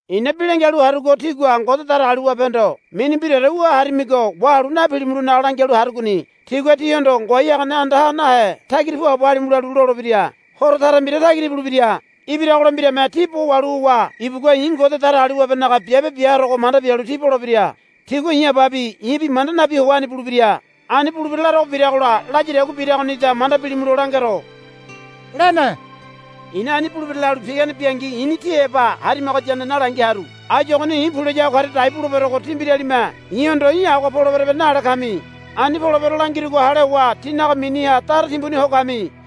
I̱na bi langialu harugo tígua Ngode Datagaliwabehondo mini mbiraore wu harimigo wahalu napilimulonaga langialu harugoni. Tigua tíhondo, Ngoai hagane andaha nahe tagira puabo halimu, lalu lolebira. Horo tara mbira tagira ibulebira. Ibiragola mbirame tí bo wahalu howa ibugua i̱ Ngode Datagaliwabenaga biabe bia harogo manda bialu tí bolebira. Tigua i̱ Ababi i̱bi manda nabi howa ani bulebira. Ani bulebira larogo biragola layadagua biragonida manda bilimulo langero, lene. I̱na ani bulebira lalu pigane biangi i̱ni tí heba harimagoyane nalangi haru. Áyu ogoni i̱ pu layago karia dai buleberogo tí mbiralime i̱hondo í̠ agoha poleberebe nale kami. Ani polebero langirugo hale howa tínaga miniha dara timbuni ho kami.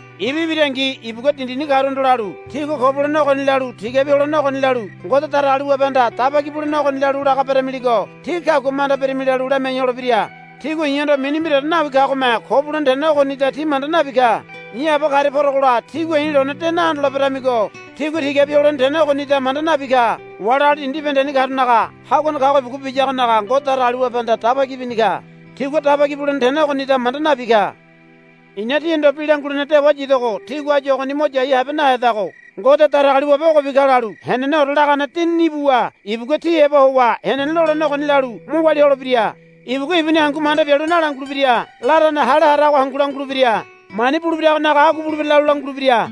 Ibu ibirangi ibugua dindini karuhondo lalu, Tígua ko bulene ogoni lalu tigabi holene ogoni lalu Ngode Datagaliwabehanda dabaki bulene ogoni lalu laga beremiligo tí kagua manda birimi, lalu lamiai holebira. Tigua i̱hondo mini mbiraore nawi kagome ko bulene tene ogonida ti manda nabi ka. I̱ Aba karia porogola tígua i̱ lone de nahondoleberamigo tigua tigabi holene tene ogonida manda nabi ka. Wali agali dindi bibahendeni karunaga haguane kago ibugua biyagonaga Ngode Datagaliwabehanda daba ki bini ka. Tigua daba ki bulene tene ogonida manda nabi ka. I̱na tíhondo bi langulene dewa yidogo tígua áyu ogoni mo yai nahabehedago. Ngode Datagaliwabe ogobi ka lalu heneneore lagane Dinini ibuwa ibugua tí heba howa henene lolene ogoni lalu mo walia holebira. Ibugua ibuni hangu manda bialu nalangulebira. Larane hale harago hangu langulebira. Mani bulebiragonaga agua bulebira lalu langulebira.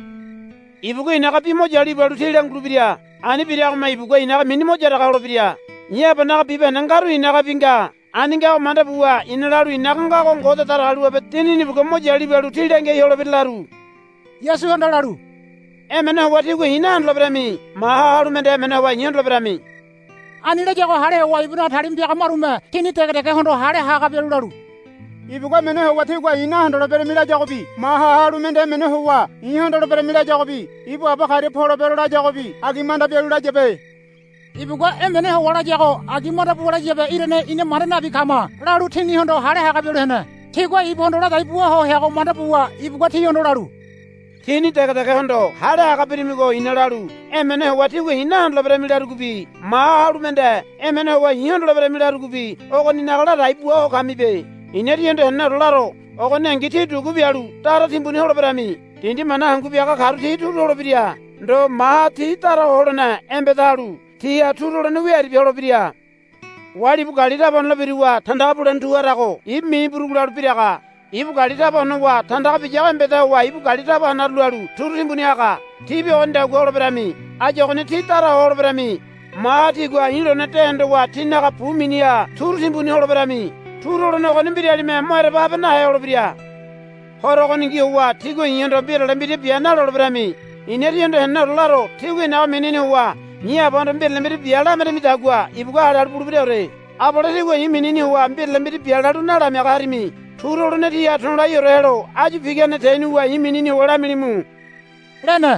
Ibugua i̱naga bi mo yalu ibalu tí langulebira. Ani biragome ibugua i̱naga mini mo yaraga holebira. I̱ Abanaga bibahende ngaru i̱nagabi nga. Ani ngago manda buwa i̱na lalu i̱naga ngago Ngode Datagaliwabe Dinini ibugua mo yalu ibalu tí langiai holebira laru. Yasuhanda lalu, Emene howa tígua i̱ nahondoleberami. Maha halu mende emene howa i̱ hondoleberami. Ani layago hale howa ibunaga talima piaga marume tini degedegehondo hale haga bialu lalu, Ibugua emene howa tígua i̱ nahondoleberami layagobi maha halu mende emene howa i̱ hondoleberami layagobi ibu Aba karia polebero layagobi agi manda bialu layabe. Ibugua emene howa layago agi manda buwa layabe irane ina manda nabi kama, lalu tinihondo hale haga bialu hene. Tigua ibuhondo ladai bua ho heago manda buwa ibugua tihondo lalu, Tíni degedegehondo hale haga birimigo i̱na lalu emene howa tígua i̱ nahondoleberami larugobi maha halu mende emene howa i̱ hondoleberami larugobi ogoninaga ladai bua ho kamibe. I̱na tíhondo heneneore laro. Ogoningi tí dugu bialu dara timbuni holeberami. Dindi mana hangu biaga karu ti turu holebira. Ndo maha tí dara ho holene embeda halu tíha turu holene wia aribia holebira. Wali ibu gali taba honole biruwa tandaga bulene tu harago ibu mini burugu lalu biraga. Ibu gali taba honowa tandaga biyago embeda howa ibu gali taba hanaru lalu turu timbuni haga. Tíbi ogonidagua holeberami. Áyu ogoni tí dara ho holeberami. Maha tígua i̱ lone de hondowa tínaga bu miniha turu timbuni holeberami. Turu holene ogoni mbiralime mo ereba habe nahe holebira. Horo ogoningi howa tígua i̱hondo mbirale mbira bia naloleberami. I̱na tíhondo heneneore laro. Tígua i̱naga minini howa i̱ Abahondo mbirale mbira bia lameramidagua ibugua hale halu bulebiraore. Abale tígua i̱ minini howa mbirale mbira bia lalu nalamiaga harimi. Turu holene tíha to̱laiore helo áyu pigane tenuwa i̱ minini howa lamilimu, lene.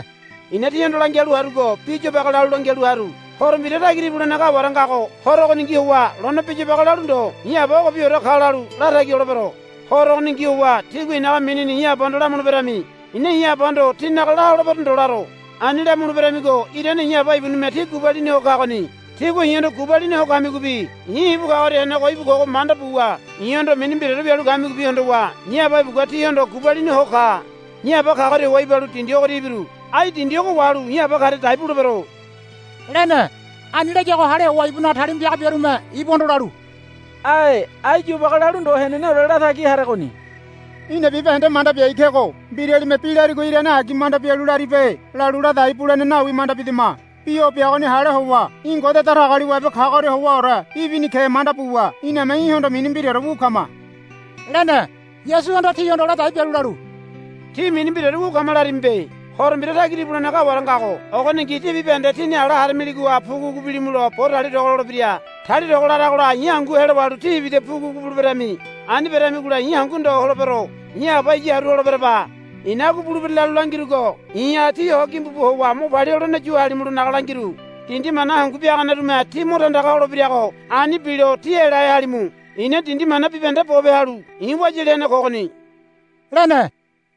I̱na tíhondo langialu harugo bi yobage lalu langialu haru. Horo mbira tagira ibulene kaware ngago horo ogoningi howa lone bi yobage lalu ndo i̱ Aba ogobiore ka lalu latagi holebero. Horo ogoningi howa tígua i̱naga minini i̱ Abahondo lamuleberami. I̱na i̱ Abahondo tínaga la holebero ndo laro. Ani lamuleberamigo irane i̱ Aba ibunime tí gubalini ho kagoni. Tígua i̱hondo gubalini ho kamigobi i̱ ibu kagoria henego íbu kogo manda buwa i̱hondo mini mbiraore wialu kamigobi hondowa i̱ Aba ibugua tíhondo gubalini ho ka. I̱ Aba kagoria howa ibalu dindi ogoria ibiru. Ai dindi ogo wahalu i̱ Aba karia dai bulebero, lene. Ani layago hale howa ibunaga talima piaga biarume ibuhondo lalu, Ae. Ai yobage lalu ndo heneneore latagi haregoni. Í̠na bibahende manda biai kego. Mbiralime bi larigo irane agi manda bialu laribe lalu ladai bulene nawi manda bidama. Bi o biagoni hale howa í̠ Ngode Datagaliwabe kagoria howaore ibini ke manda buwa iname í̠hondo mini mbiraore wu kama, lene. Yasuhanda tihondo ladai bialu lalu, Tí mini mbiraore wu kama larimibe. Horo mbira tagira ibulene kaware ngago ogoningi tí bibahende tíni ala haramiligoha pugupugu bilimulo bo talia togo lolebira. Talia togo laragola i̱ hangu helo wahalu tí ibida pugupugu buleberami. Ani beremigola i̱ hangu ndo holebero. I̱ Aba iya haru holeberaba. I̱na agua bulebira lalu langirugo i̱ha tí ho gimbu bu howa mo palia holene yu halimulonaga langiru. Dindi mana hangu biaganerume tí mo tandaga holebirago ani bilo tí elahe halimu. I̱na dindi mana bibahende bope halu i̱ wayali hene kogoni, lene.